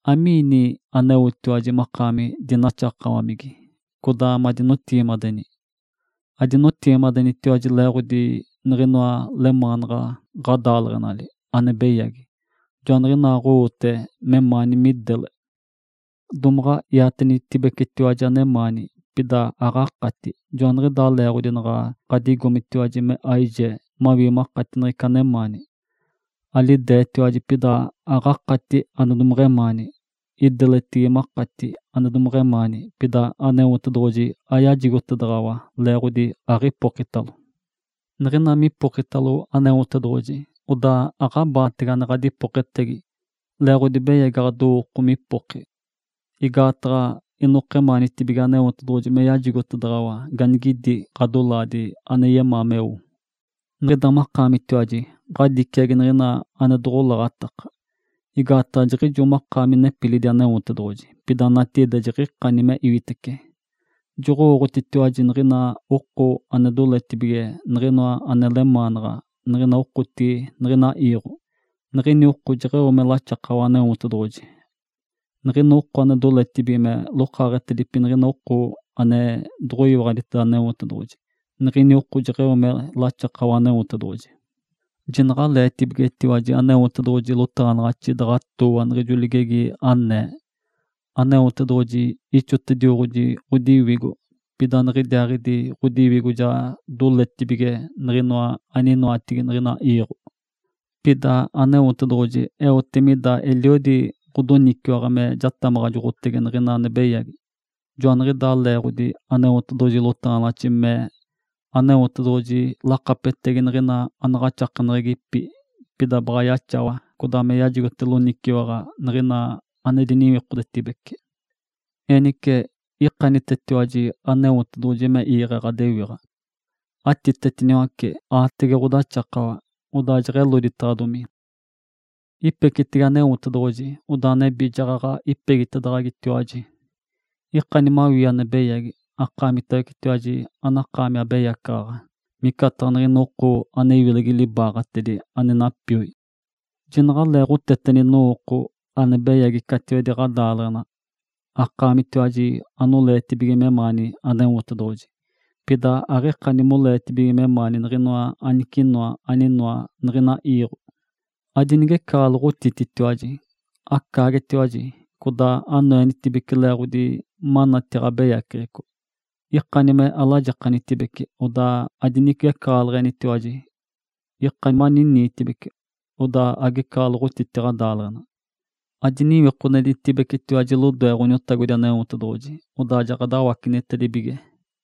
Amiina aneotiwaji makaami dinaxakawamigi, codaa madinideleɡ̶eni? Adinideleɡ̶enitiwaji leeɡ̶otedi niɡ̶inoa lemaanaɡ̶a ɡ̶adaaleɡ̶enali ane beyagi, joaniɡ̶inaaɡ̶owote memaani midele. Domaɡ̶a iatenitibigetiwaji anemaani, pida aɡ̶akati, joaniɡ̶idaa leeɡ̶odi naɡ̶a ɡ̶adigomitiwaji me aijee mawii makati niɡ̶ina anemaani. Alideetiwaji, pida aɡ̶akati ane domeɡ̶emaani. Ideletigi makati ane domeɡ̶emaani, pida Aneotedoɡ̶oji ayajigotedaɡ̶awa leeɡ̶odi atipokitalo. Niɡ̶ina mipokitalotiwaji Aneotedoɡ̶oji, odaa aɡ̶abaatege ane ɡ̶adipoketegi, leeɡ̶odi beyagi ɡ̶adowooko mipoki. Igaataɡ̶a inokemaanitibige Aneotedoɡ̶oji me yajigotedaɡ̶awa ganigidi ɡ̶adolaadi ane yemaa meo. Niɡ̶ida makaamitiwaji ɡ̶adiciagi niɡ̶ina ane noɡ̶olaɡ̶atakanaɡ̶a, igaataɡ̶a jiɡ̶ijo makaami nepilidi Aneotedoɡ̶oji, pida natigide jiɡ̶ikani me iwitece. Joɡ̶owooɡ̶otitiwaji niɡ̶ina oko ane doletibige niɡ̶inoa ane lemaanaɡ̶a niɡ̶ina okotigi niɡ̶ina iiɡ̶o, niɡ̶ini oko jeɡ̶eo me laxakawa Aneotedoɡ̶oji. Niɡ̶ina oko ane doletibige me lokaaɡ̶etedipi niɡ̶ina oko ane doɡ̶oyiwaɡ̶aditeda Aneotedoɡ̶oji, niɡ̶ini oko jeɡ̶eo me laxakawa Aneotedoɡ̶oji. Jinaɡ̶aleetibigetiwaji Aneotedoɡ̶oji lotaɡ̶anaɡ̶axi daɡ̶atooa niɡ̶ijo ligegi, anee, “Aneotedoɡ̶oji ixotedioɡ̶oji ɡ̶odiwigo. Pida niɡ̶idiaaɡ̶idi ɡ̶odiwigo ja doletibige niɡ̶inoa aninoatigi niɡ̶ina iiɡ̶o.” Pida Aneotedoɡ̶oji eote mida eliodi ɡ̶odoniciwaɡ̶a me jatamaɡ̶ajoɡ̶otege niɡ̶ina ane beyagi. Joaniɡ̶idaa leeɡ̶odi Aneotedoɡ̶oji lotaɡ̶anaɡ̶axi mee, “Aneotedoɡ̶oji lakapetegi niɡ̶ina anaɡ̶axakeneɡ̶egipi, pida baɡ̶a yaxawa codaa me yajigote loniciwaɡ̶a niɡ̶ina ane diniwikodetibece.” Enice, ikanitecetiwaji Aneotedoɡ̶oji me iiɡ̶e ɡ̶adewiɡ̶a. Atitetiniwace aatege ɡ̶odaxakawa, odaa jeɡ̶eloditaɡ̶adomi. Ipecitege Aneotedoɡ̶oji, odaa nebi jaɡ̶aɡ̶a ipegitedaɡ̶agitiwaji. Ikani mawii ane beyagi, akaamitiwaji anakaami abeyacaɡ̶aɡ̶a, micataɡ̶a niɡ̶ina oko me iwilegi libaaɡ̶atedi ane napioi. Jinaɡ̶aleeɡ̶oteteni nowooko ane beyagi catiwedi ɡ̶adaaleɡ̶enali, akaamitiwaji anoleetibige memaani Aneotedoɡ̶oji, pida aɡ̶ikani moleetibige memaani niɡ̶inoa anicinoa aninoa niɡ̶ina iiɡ̶o. Adinigecaɡ̶aloɡ̶otititiwaji, acaagetiwaji, codaa me anoenitibece leeɡ̶odi manati ɡ̶abeyaceɡ̶eco. Ikani me alajikanitibece, odaa adinigecaɡ̶aloɡ̶otititiwaji. Ikani maniniitibece, odaa agecaɡ̶aloɡ̶otiti ɡ̶adaaleɡ̶ena. Adiniwikodenitibecetiwaji lodoe Ǥoniotagodi Aneotedoɡ̶oji, odaa jaɡ̶adawacenitacedibige.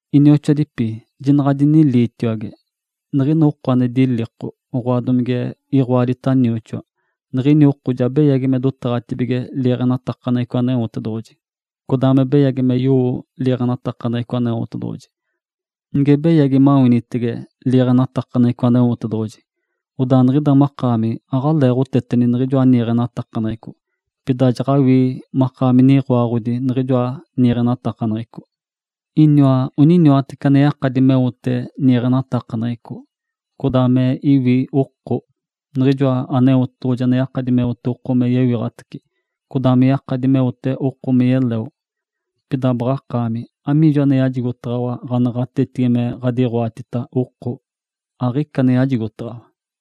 Inioxoadipi, jinaɡ̶adiniliitiwage. Niɡ̶ina ane diliko, oɡ̶oa, domige iɡ̶oadi nioxoa, niɡ̶ini oko ja beyagi me dotaɡ̶atibige liiɡ̶enatakaneɡ̶eco Aneotedoɡ̶oji, codaa me beyagi me yowo liiɡ̶enatakaneɡ̶eco Aneotedoɡ̶oji. Nige beyagi mawinitece liiɡ̶enatakaneɡ̶eco Aneotedoɡ̶oji, odaa niɡ̶ida makaami aɡ̶aleeɡ̶oteteni niɡ̶ijoa niiɡ̶enatakaneɡ̶eco, pida jaɡ̶awii makaami niɡ̶oaɡ̶odi niɡ̶ijoa niiɡ̶enatakaneɡ̶eco. Iniwa oniniwatece ane yakadi meote niiɡ̶enatakaneɡ̶eco, codaa me iwi oko, Niɡ̶ijoa Aneotedoɡ̶oji ane yakadi meote oko me yewiɡ̶atace, codaa me yakadi meote oko me yeleo. Pida, baɡ̶akaami, amiijo ane yajigotaɡ̶awa ɡ̶anaɡ̶atetigi me ɡ̶adiɡ̶oatita oko? Aɡ̶ica ane yajigotaɡ̶awa!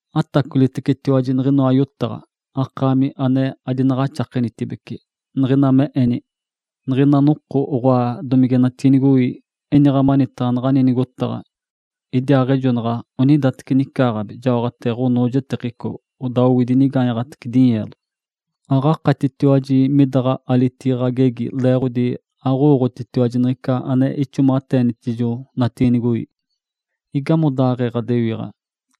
Atacolitecetiwaji niɡ̶inoa yotaɡ̶a, akaami ane adinaɡ̶axakenitibece, niɡ̶ina me eni, “Niɡ̶ina noko, oɡ̶oa, domige natiinigoi, iniɡ̶a manitaɡ̶a naɡ̶ani nigotaɡ̶a. Idiaaɡ̶ejonaɡ̶a onidateci nicaaɡ̶abi, jaoɡ̶ate ɡ̶onoojetekico, odaa owidi inigaanyaɡ̶atece dinyeelo.” Aɡ̶akatitiwaji midaɡ̶a alitigi ɡ̶agegi leeɡ̶odi aɡ̶owooɡ̶otitiwaji niɡ̶ica ane ixomaɡ̶ateenitijo natiinigoi. Igamodaaɡ̶ee ɡ̶adewiɡ̶a?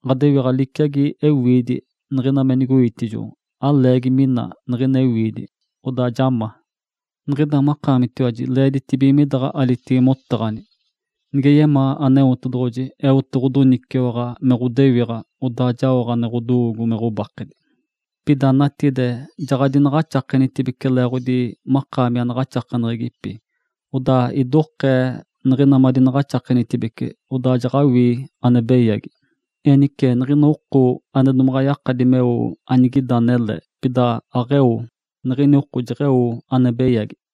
Ǥadewiɡ̶a liciagi niɡ̶ina ewiidi niɡ̶ina me nigoitijo. Aleegi mina niɡ̶ina ewiidi, odaa ja ma. Niɡ̶ida makaamitiwaji leeditibige midaɡ̶a ɡ̶agegi motaɡ̶ani, “Nige yemaa Aneotedoɡ̶oji, eote ɡ̶odoniciwaɡ̶a me ɡ̶odewiɡ̶a, odaa jaoɡ̶a ane ɡ̶odowoogo me ɡ̶obakedi.” Pida natigide, jaɡ̶adinabakenitibece leeɡ̶odi makaami anaɡ̶axakeneɡ̶egipi. Odaa idokeeta niɡ̶ina madinabakenitibecetiwaji, odaa jaɡ̶awii ane beyagi. Enice, niɡ̶ina oko ane domaɡ̶a yakadi meo anigida anele, pida aɡ̶eo, niɡ̶ini oko jeɡ̶eo ane beyagi.